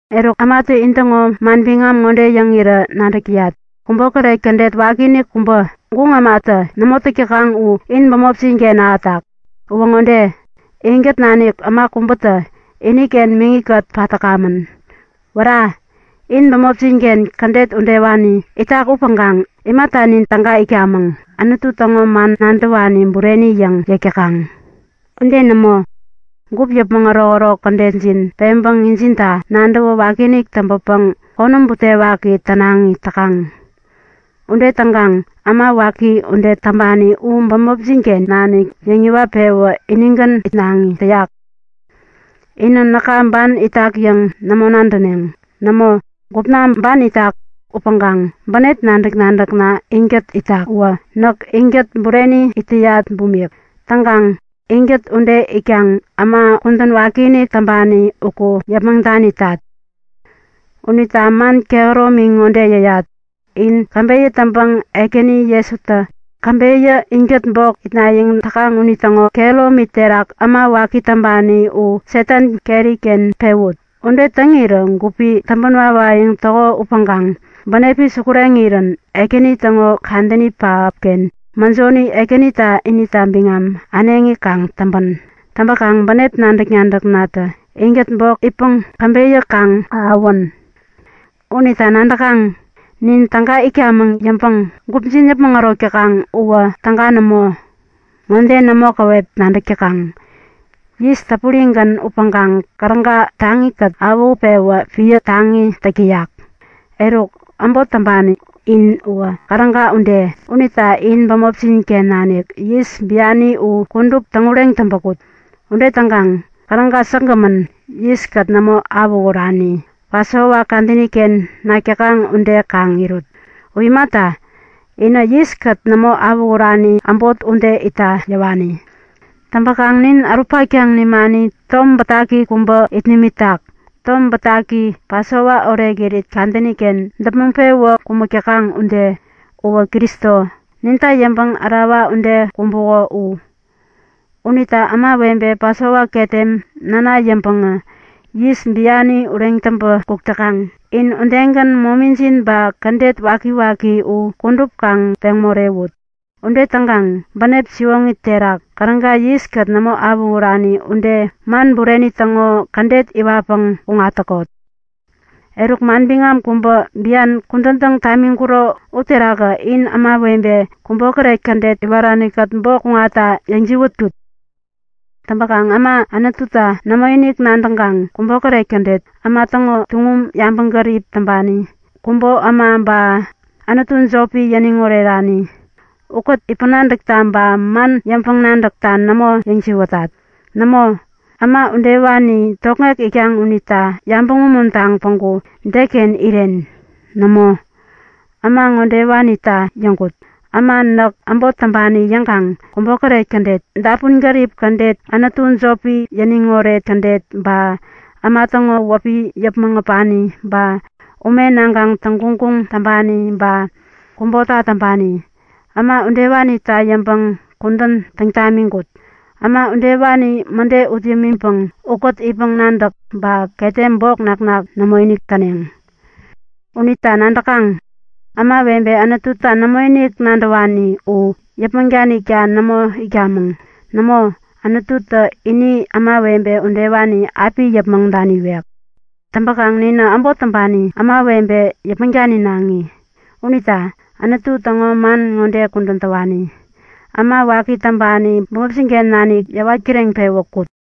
Eruk, ämatä intäŋo manbiŋam ŋode yäŋirä nadäk täyat; Kubokäret kädet wakiinik kubä, guŋ ämatä nämo täk täkaŋ u in bämopjin-ken ahätak. Uwä ŋode; Inkät nanik äma kubätä iniken miŋi-kät pat täkamän. Wära! In bämopjin-ken kädet udewani itak upäŋkaŋ imata nin täga itkamäŋ, Anutu täŋo man nadäwani bureni yäŋ yäk täkaŋ? Ude nämo, gup yäpmäŋ ärokärok kädetjin peŋpäŋ injinta nadäwä wakiinik täŋpäpäŋ konäm butewaki tänaŋi täkaŋ. Ude täŋkaŋ äma waki ude täŋpani u bämopjin-ken nanik yäŋiwat-pewä inigän itnaŋi täyak. Inä näka ban itak yäŋ nämo nadäneŋ. Nämo, gupna ban itak upäŋkaŋ bänep nadäk-nadäkna inkät itak uwä näk inkät bureni it täyat bumik. Täŋkaŋ inkät ude itkaŋ äma kudän wakiinik täŋpani uku yäpmäŋ danitat. Unita man kehäromi ŋode yäyat; In käbeyä täŋpäŋ Ekäni Jesutä käbeyä inkät bok itnayäŋ täkaŋ unitäŋo kehäromi terak äma waki täŋpani u Satan keri-ken pewut. Ude täŋirä gupi täŋpän wawayäŋ täko upäŋkaŋ bänepi sukureŋirän Ekäni täŋo kadäni pähapken mäjoni Ekänitä inita biŋam äneŋi kaŋ täŋpän. Täŋpäkaŋ bänep nadäk-nadäknatä inkät bok itpäŋ käbeyä kaŋ ahäwän. Unita nadäkaŋ? Nin täga itkamäŋ yäŋpäŋ gupjin yäpmäŋ ärok täkaŋ uwä täga nämo. Ŋode nämo käwep nadäk täkaŋ; Yis täpurigän upäŋkaŋ käräga taŋi-kät awähutpewä piä taŋi täk täyak. Eruk äbot täŋpani in uwä käräga ude. Unita in bämopjin-ken nanik yis biani u kudup täŋureŋ täŋpä kut. Ude täŋkaŋ käräga säkgämän, yiskät nämo awähurani, Pasova kadäni-ken nak täkaŋ ude kaŋ irut. U imata, inä yiskät nämo awähurani äbot ude itta yäwani. Täŋpäkaŋ nin ärut-paktaŋ nimani tom bätaki kubä it nimitak, tom bätaki, Pasova orekirit kadäni-ken däpmäŋ-pewä kumäk täkaŋ ude. Uwä Kristo, ninta yäŋpäŋ ärawa ude kumbuko u. Unita ämawebe Pasova ketem näna yäŋpäŋä yis biani ureŋ täŋpä kuk täkaŋ, in udegän momijin ba kädet wakiwaki u kudup kaŋ peŋ morewut. Ude täŋkaŋ bänep siwoŋi terak, käräga yiskät nämo awähurani ude man bureni täŋo kädet iwatpäŋ kuŋat täkot. Eruk, manbiŋam kubä bian kudän täŋ tamiŋkuro uterakä in ämawebe kubokäret kädet iwarani-kät bok kuŋatta yäjiwätkut. Täŋpäkaŋ äma Anututa nämoinik nadäŋkaŋ kubokäret kädet, äma täŋo tuŋum yabäŋgärip täŋpani, kubo äma ba anutu jopi yäniŋ orerani ukät itpäŋ-nadäkta ba man yäŋpäŋ-nadäkta nämo yäjiwätat. Nämo, äma udewani tokŋek itkaŋ unita yabäŋ umuntaŋ päŋku deken iren? Nämo, äma ŋodewanita yäŋkut; Äma näk äbot täŋpani yäŋkaŋ kubokäret kädet, dapun-gärip kädet, anutu jopi yäniŋoret kädet, ba äma täŋo wäpi yäpmäŋ äpani, ba ume naŋkaŋ täŋguŋguŋ täŋpani ba kubota täŋpani, äma udewanita yäŋpäŋ kudän täŋ tamiŋkut. Äma udewani mäde ut yämiŋpäŋ ukät itpäŋ-nadäk ba ketem bok naknak nämoinik täneŋ. Unita nadäkaŋ? Ämawebe Anututa nämoinik nadäwani u yäpmäŋ danikta nämo itkamäŋ. Nämo, Anututä ini ämawebe udewani api yäpmäŋ daniwek. Täŋpäkaŋ ninä äbot täŋpani ämawebe yäpmäŋ daninaŋi. Unita Anutu täŋo man ŋode kudän täwani; Äma waki täŋpani bämopjin-ken nanik yäwat kireŋpewä kut!